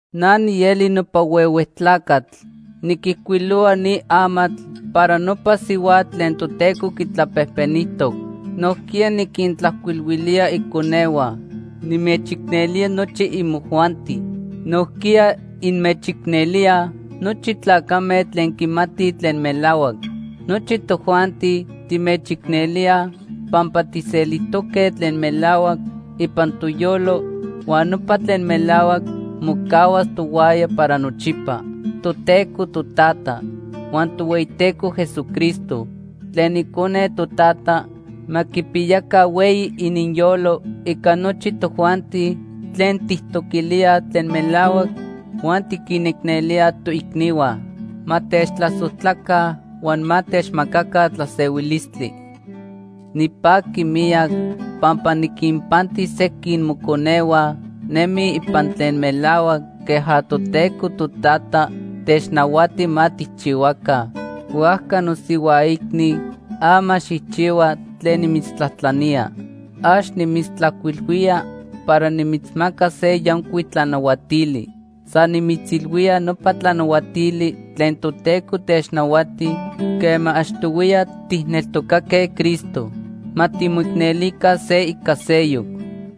Na nieli nopa huehue tlacatl niquijcuilohua ni amatl para nopa sihuatl tlen Toteco quitlapejpenijtoc. Nojquiya niquintlajcuilhuilía iconehua. Nimechicnelía nochi imojuanti. Nojquiya inmechicnelíaj nochi tlacame tlen quimatij tlen melahuac. Nochi tojuanti timechicnelíaj pampa tijselijtoque tlen melahuac ipan toyolo huan nopa tlen melahuac mocahuas tohuaya para nochipa. Toteco Totata huan Tohueyiteco Jesucristo tlen Icone Totata ma quipiyaca hueyi ininyolo ica nochi tojuanti tlen tijtoquilíaj tlen melahuac huan tiquinicnelíaj toicnihua. Ma techtlasojtlaca huan ma techmacaca tlasehuilistli. Nipaqui miyac pampa niquinpanti sequin moconehua nemij ipan tlen melahuac queja Toteco Totata technahuati ma tijchihuaca. Huajca nosihuaicni, ama xijchihua tlen nimitztlajtlanía. Ax nimitztlajcuilhuía para nimitzmacas se yancuic tlanahuatili. San nimitzilhuía nopa tlanahuatili tlen Toteco technahuati quema achtohuiya tijneltocaque Cristo. Ma timoicnelica se ica seyoc.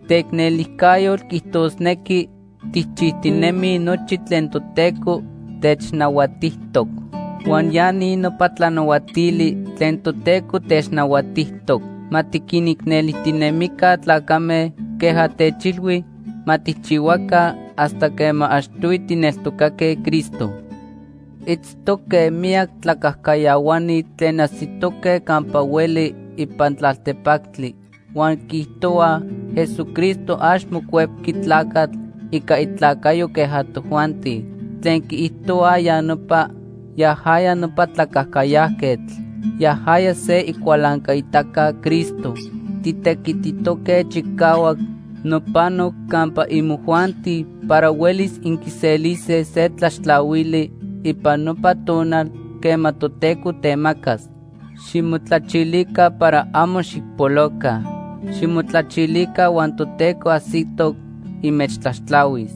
Teicnelijcayotl quiijtosnequi tijchijtinemij nochi tlen Toteco technahuatijtoc. Huan ya ni nopa tlanahuatili tlen Toteco technahuatijtoc: Ma tiquinicnelijtinemica tlacame queja techilhui ma tijchihuaca hasta quema achtohui tijneltocaque Cristo. Itztoque miyac tlacajcayahuani tlen ajsitoque campa hueli ipan tlaltepactli huan quiijtohuaj Jesucristo ax mocuepqui tlacatl ica itlacayo queja tojuanti. Tlen quiijtohua ya nopa, yajaya nopa tlacajcayajquetl. Yajaya se icualancaitaca Cristo. Titequititoque chicahuac nopano campa imojuanti para huelis inquiselise se tlaxtlahuili ipan nopa tonal quema Toteco temacas. Ximotlachilica para amo xijpoloca. Ximotlachilica huan Toteco ajsitoc inmechtlaxtlahuis.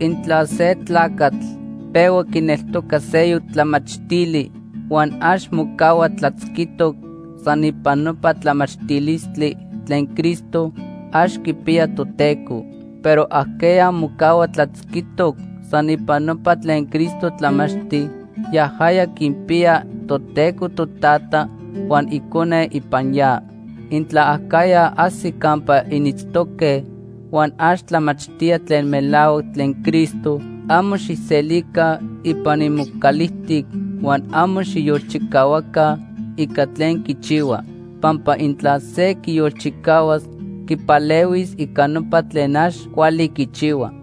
Intla se tlacatl pehua quineltoca seyoc tlamachtili huan ax mocahua tlatzquitoc san ipan nopa tlamachtilistli tlen Cristo, ax quipiya Toteco. Pero ajqueya mocahua tlatzquitoc san ipan nopa tlen Cristo tlamachti, yajaya quinpiya Toteco Totata huan Icone ipan ya. Intla acajya ajsi campa initztoque huan ax tlamachtía tlen melahuac tlen Cristo, amo xijselica ipan imocalijtic huan amo xijyolchicahuaca ica tlen quichihua. Pampa intla se quiyolchicahuas, quipalehuis ica nopa tlen ax cuali quichihua.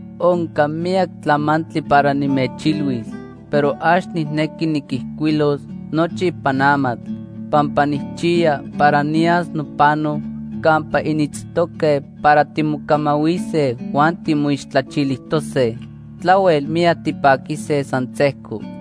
Onca miyac tlamantli para nimechilhuis, pero ax nijnequi niquijcuilos nochi ipan amatl pampa nijchiya para niyas nopano campa initztoque para timocamahuise huan timoixtlachilijtose. Tlahuel miyac tipaquise san sejco.